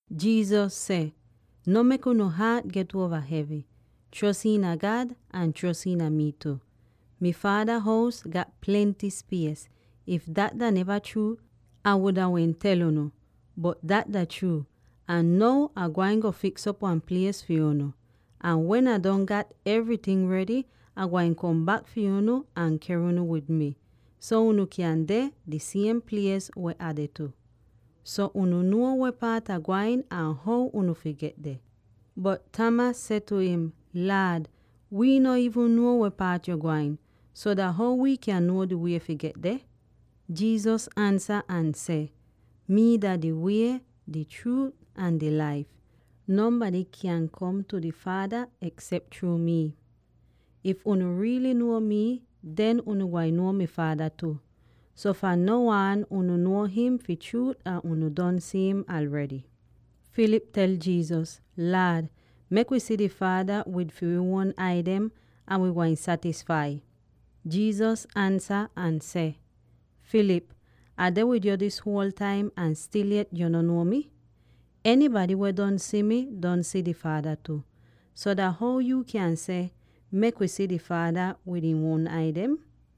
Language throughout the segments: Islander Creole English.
Jesus seh, “No mek unu haat get uova hevy; chros iina God ahn chros iina mii tu. Mi Faada hous gat plenty spies. If dat dah neva chruu, Ah wuda wehn tel unu; bot dat dah chruut, ahn now Ah gwain go fiks'op wan plies fi unu. Ahn wen Ah don gat evryting redy, Ah gwain kom bak fi unu ahn ker unu wid mi, so unu kyan deh, di siem plies weh Ah deh tu. So unu nuo weh paat Ah gwain ahn how unu fi get deh.” Bot Thomas seh tu im, “Laad, wii no iivn nuo weh paat yo gwain; so dah how wi kyan nuo di wie fi get deh?” Jesus ansa ahn seh, “Mii dah di Wie, di Chruut, ahn di Laif; nonbady kyaahn kom tu di Faada eksep chruu mi. If unu riily nuo mii, den unu gwain nuo mi Faada tu. So fahn now aan unu nuo him fi chruut ahn unu don si him aredy.” Philip tel Jesus, “Laad, mek wi si di Faada wid fi wi uon ai dem, ahn wi gwain satisfai.” Jesus ansa ahn seh, “Philip, Ah deh wid yu dis huol taim ahn stil yet yu no nuo mi? Enybady weh don si mii, don si di Faada tu. So dah how yu kyan seh, ‘Mek wi si di Faada wid wi uon ai dem’?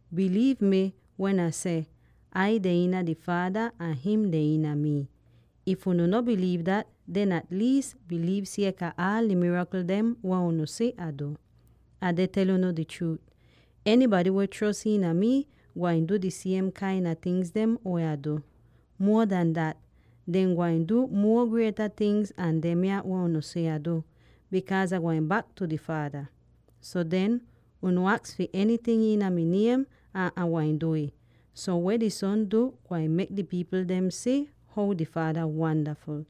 Biliiv mi wen Ah seh Ai deh iina di Faada ahn him deh iina mii. If unu no biliiv dat, den at liis biliiv sieka aala di mirakl dem weh unu si Ah du. “Ah deh tel unu di chruut: enybady weh chros iina mi gwain du di siem kain a tingz weh Ah du. Muo an dat, dehn gwain du muo grieta tingz an demya weh unu si Ah du, bikaaz Ah gwain bak tu di Faada. So den, unu aks fi enyting iina mi niem, ahn Ah gwain du'ih, so weh di Son du, gwain mek di pipl dem si how di Faada wandaful.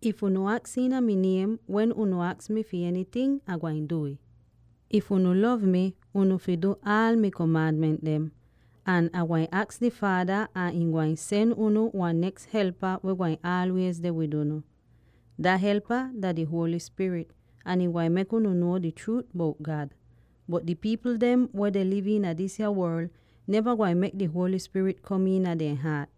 If unu aks iina mi niem, wen unu aks mi fi enyting, Ai gwain du'ih. “If unu lov mi, unu fi du aal mi komaanment dem. Ahn Ah gwain aks di Faada ahn ihn gwain sen unu wan neks Helpa weh gwain aalwiez deh wid unu. Dah Helpa dah di Holy Spirit ahn ihn gwain mek unu nuo di chruut bout God. Bot di pipl dem weh deh liv iina disa worl, neva gwain mek di Holy Spirit kom iina dehn haat,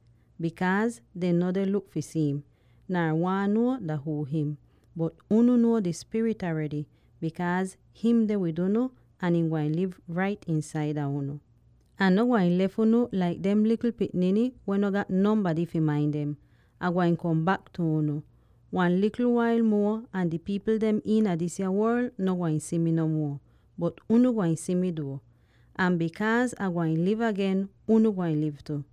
bikaaz dehn no deh luk fi si'im, nar waahn nuo dah huu him. Bot unu nuo di Spirit aredy, bikaaz him deh wid unu, ahn ihn gwain liv rait iinsaida unu. “Ah no gwain lef unu laik dem likl pikniny weh no gat nonbady fi main dem; Ah gwain kom bak tu unu. Wan likl wail muo ahn di pipl dem iina disa worl no gwain si mi no muo, bot unu gwain si mi duo. Ahn bikaaz Ah gwain liv agen, unu gwain liv tu.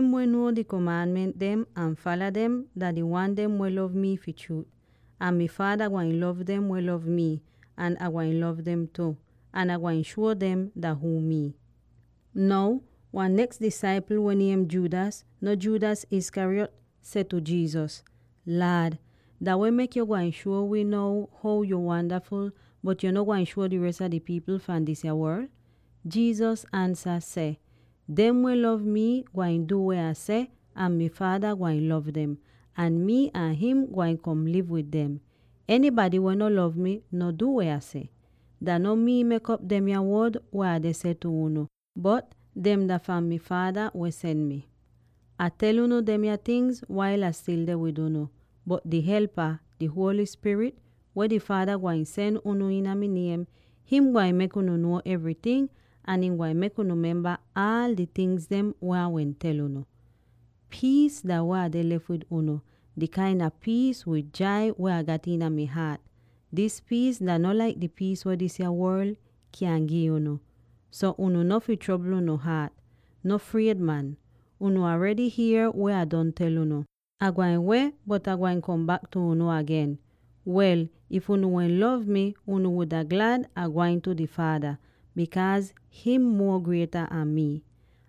Dem weh nuo mi komaanment dem ahn fala dem dah di wan dem weh lov mi fi chruut. Ahn mi Faada gwain lov dem weh lov mii, ahn Ah gwain lov dem tu; ahn Ah gwain shuo dem dah huu mii.” Now wan neks disaipl weh niem Judas —no Judas Iscariot— seh tu Jesus, “Laad, dah weh mek yuu gwain shuo wii now how yo wandaful, bot yo no gwain shuo di res a di pipl fahn disa worl?” Jesus ansa seh, “Dem weh lov mi gwain du weh Ah seh, ahn mi Faada gwain lov dem, ahn mii ahn him gwain kom liv wid dem. Enybady weh no lov mi, no du weh Ah seh. Dah no mii mek'op demya wod weh Ah deh tel unu, bot dem dah fahn mi Faada weh sen mii. “Ah tel unu demya tingz wail Ah stil deh wid unu. Bot di Helpa —di Holy Spirit— weh di Faada gwain sen unu iina mi niem, him gwain mek unu nuo evryting ahn ihn gwain mek unu memba aal di tingz weh Ah wehn tel unu. “Piis dah weh Ah deh lef wid unu, di kain a piis wid jai weh Ah gat iina mi haat. Dis piis dah no laik di piis weh disa worl kyan gi unu. So unu no fi trobl unu haat; no fried, man! Unu aredy hier weh Ah don tel unu, ‘Ah gwain weh, bot Ah gwain kom bak tu unu agen.’ Wel, if unu wehn lov mi, unu wuda glad Ah gwain tu di Faada, bikaaz him muo grieta an mii!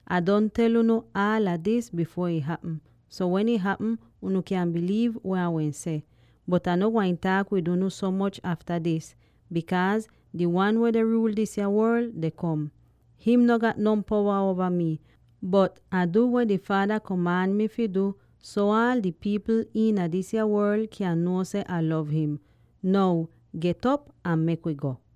“Ah don tel unu aala dis bifuor ih hapm, so wen ih hapm, unu kyan biliiv weh Ah wehn seh. Bot Ah no gwain taak wid unu so moch afta dis, bikaaz di wan weh deh ruul disa worl deh kom. Him no gat non powa uova mii, bot Ah du weh di Faada komaan mii fi du, so aal di pipl iina disa worl kyan nuo seh Ah lov him. “Now, get'op ahn mek wi go!”